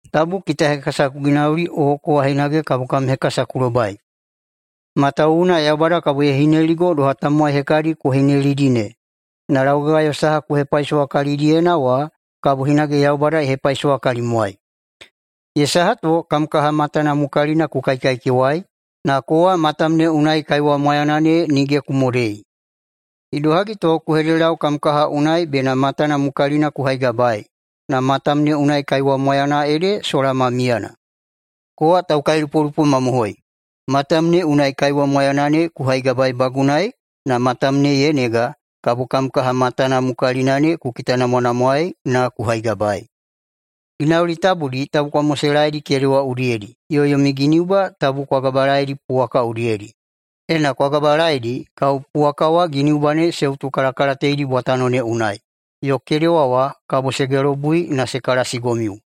“Tabu kitahekasa ku ginauli o kowa hinage kabo kam hekasa ku lobai. Matawuwuna Yaubada kabo ye hineligo doha tamowai hekadi ku hinelidi ne, na laugagayo saha ku hepaisowa kalidiyena wa kabo hinage Yaubada ye hepaisowa kalimwai. Ye saha to kam kaha matana mukalina ku kaikaikewai, na kowa matam ne unai kaiwa mwayana ne nige ku modei? Idohagi to ku hededelau kam kaha unai bena matana mukalina ku haigabaei, na matam ne unai kaiwa mwayana ede sola ma miyana? Kowa taukailupolupo mamohoi, matam ne unai kaiwa mwayana ne ku haigabaeibagunai na matam ne ye nega, kabo kam kaha matana mukalina ne ku kitanamwanamwaei na ku haigabaei. Ginauli tabudi tabu kwa moselaeidi kedewa udiyedi yo yomi giniuba tabu kwa gabalaeidi puwaka udiyedi. Ena ku gabalaeidi, kabo puwaka wa giniuba ne se utukalakalateidi bwatano ne unai, yo kedewa wa kabo se gelobui na se kalasigomiu.”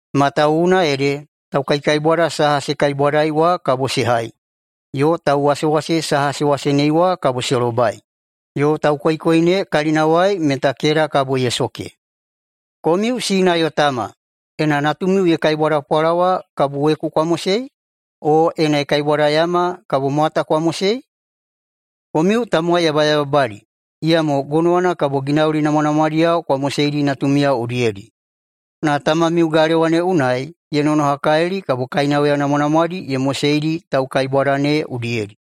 Matawuwuna ede taukaikaibwada saha se kaibwadai wa kabo se hai, yo tauwasewase saha se wasenei wa kabo se lobai, yo taukoikoi ne kalinawai meta keda kabo ye soke. Komiu [sina yo tama], ena natumiu ye kaibwada pwalawa kabo weku kwa mosei? O ena ye kaibwada yama, kabo mwata kwa mosei? Komiu tamowai yabayababadi, iyamo gonowana kabo ginauli namwanamwadiyao kwa moseidi natumiyao udiyedi. Na tamamiu galewa ne unai ye nonohakalili kabo kainauya namwanamwadi ye moseidi taukaibwada ne udiyedi.”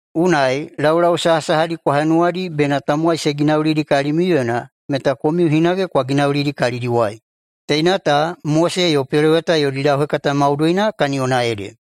“Unai, laulau sahasahadi kwa henuwadi bena tamowai se ginaulidi kalimiuyena meta komiu hinage kwa ginaulidi siya kalidiwai. Teina ta Mose yo peloweta yodi lauhekata maudoina kaniyona ede.”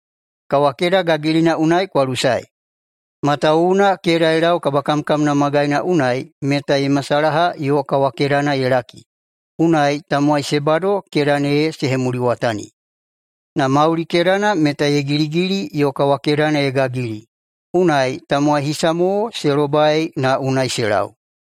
“Kawakeda gagilina unai kwa lusae. Matawuwuna keda ye lau kabakamkamna magaina unai meta ye masalaha yo kawakedana ye laki, unai tamowai se bado keda ne se hemuliwatani. Na mauli kedana meta ye giligili yo kawakedana ye gagili, unai tamowai hisa mo se lobai na unai se lau.”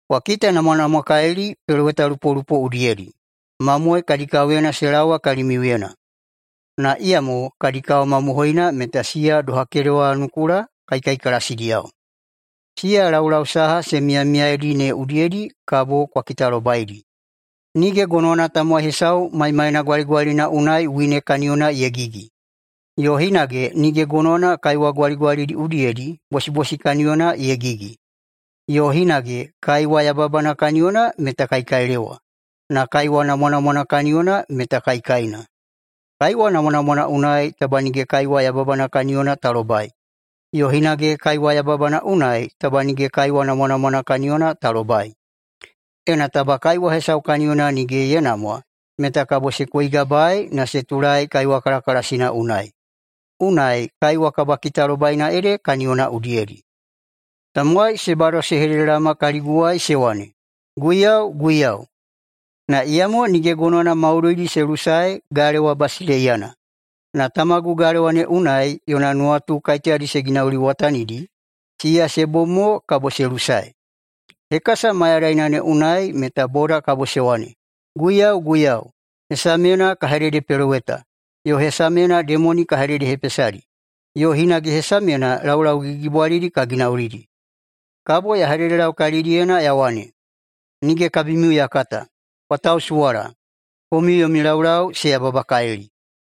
“Kwa kitanamwanamwakalili pelowetalupolupo udiyedi. Mamoe kadi kaoyena se laowa kalimiuyena, na iyamo kadi kao mamohoina meta siya doha kedewanukula kaikaikalasidiyao. Siya laulau saha se miyamiyaedi ne udiyedi kabo kwa kitalobaidi. Nige gonowana tamowai hesau maimaina gwaligwalina unai wine kaniyona ye gigi, yo hinage nige gonowana kaiwa gwaligwalidi udiyedi bosibosi kaniyona ye gigi. Yo hinage kaiwa yababana kaniyona meta kaikailewa, na kaiwa namwanamwana kaniyona meta kaikaina. Kaiwa namwanamwana unai taba nige kaiwa yababana kaniyona ta lobai, yo hinage kaiwa yababana unai taba nige kaiwa namwanamwana kaniyona ta lobai. Ena taba kaiwa hesau kaniyona nige se namwa meta kabo se koigabaei na se tulaei kaiwa kalakalasina unai. Unai kaiwa kabakitalobaina ede kaniyona udiyedi. Tamowai se bado se hededelaoma kaliguwai se wane, ‘Guiyau, Guiyau!’, na iyamo nige gonowana maudoidi se lusae galewa basileiyana, na tamagu galewa ne unai yona nuwatu kaiteyadi se ginauliwatanidi, siya se bom mo kabo se lusae. Hekasa mayadaina ne unai meta boda kabo se wane, ‘Guiyau, Guiyau, hesamyena ka hededepeloweta, yo hesamyena demoni ka hededehepesadi, yo hinage hesamyena laulau gigigigibwalidi ka ginaulidi.’ Kabo ya hededelau kalidiyena ya wane, ‘Nige kabimiu ya kata, kwa tausuwala, komiu yomi laulau se yababakalili.’”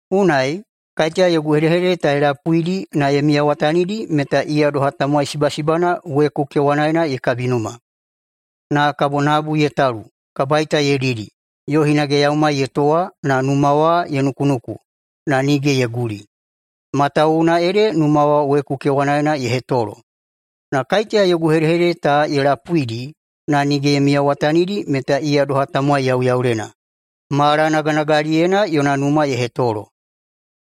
“Unai, kaiteya yogu hedehedede ta ye lapuidi na ye miyawatanidi meta iya doha tamowai sibasibana weku kewanaena ye kabinuma. Na kabo nabu ye talu, kabaita ye didi, yo hinage yaumai ye towa na numa wa ye nukunuku, na nige ye guli, matawuwuna ede numa wa weku kewanaena ye hetolo. Na kaiteya yogu hedehedede ta ye lapuidi na nige ye miyawatanidi meta iya doha tamowai yauyaulena, malanaganagaliyena yona numa ye hetolo.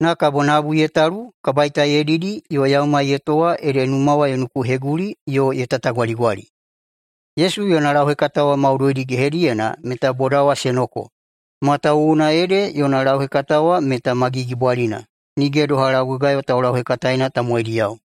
Na kabo nabu ye talu, kabaita ye didi yo yaumai ye towa ede numa wa ye nukuheguli yo ye tatagwaligwali.” Yesu yona lauhekata maudoidi wa gehediyena meta boda wa se noko, matawuwuna ede yona lauhekata wa meta ma gigibwalina, nige doha laugagayo taulauhekataeina tamowaidiyao. ———————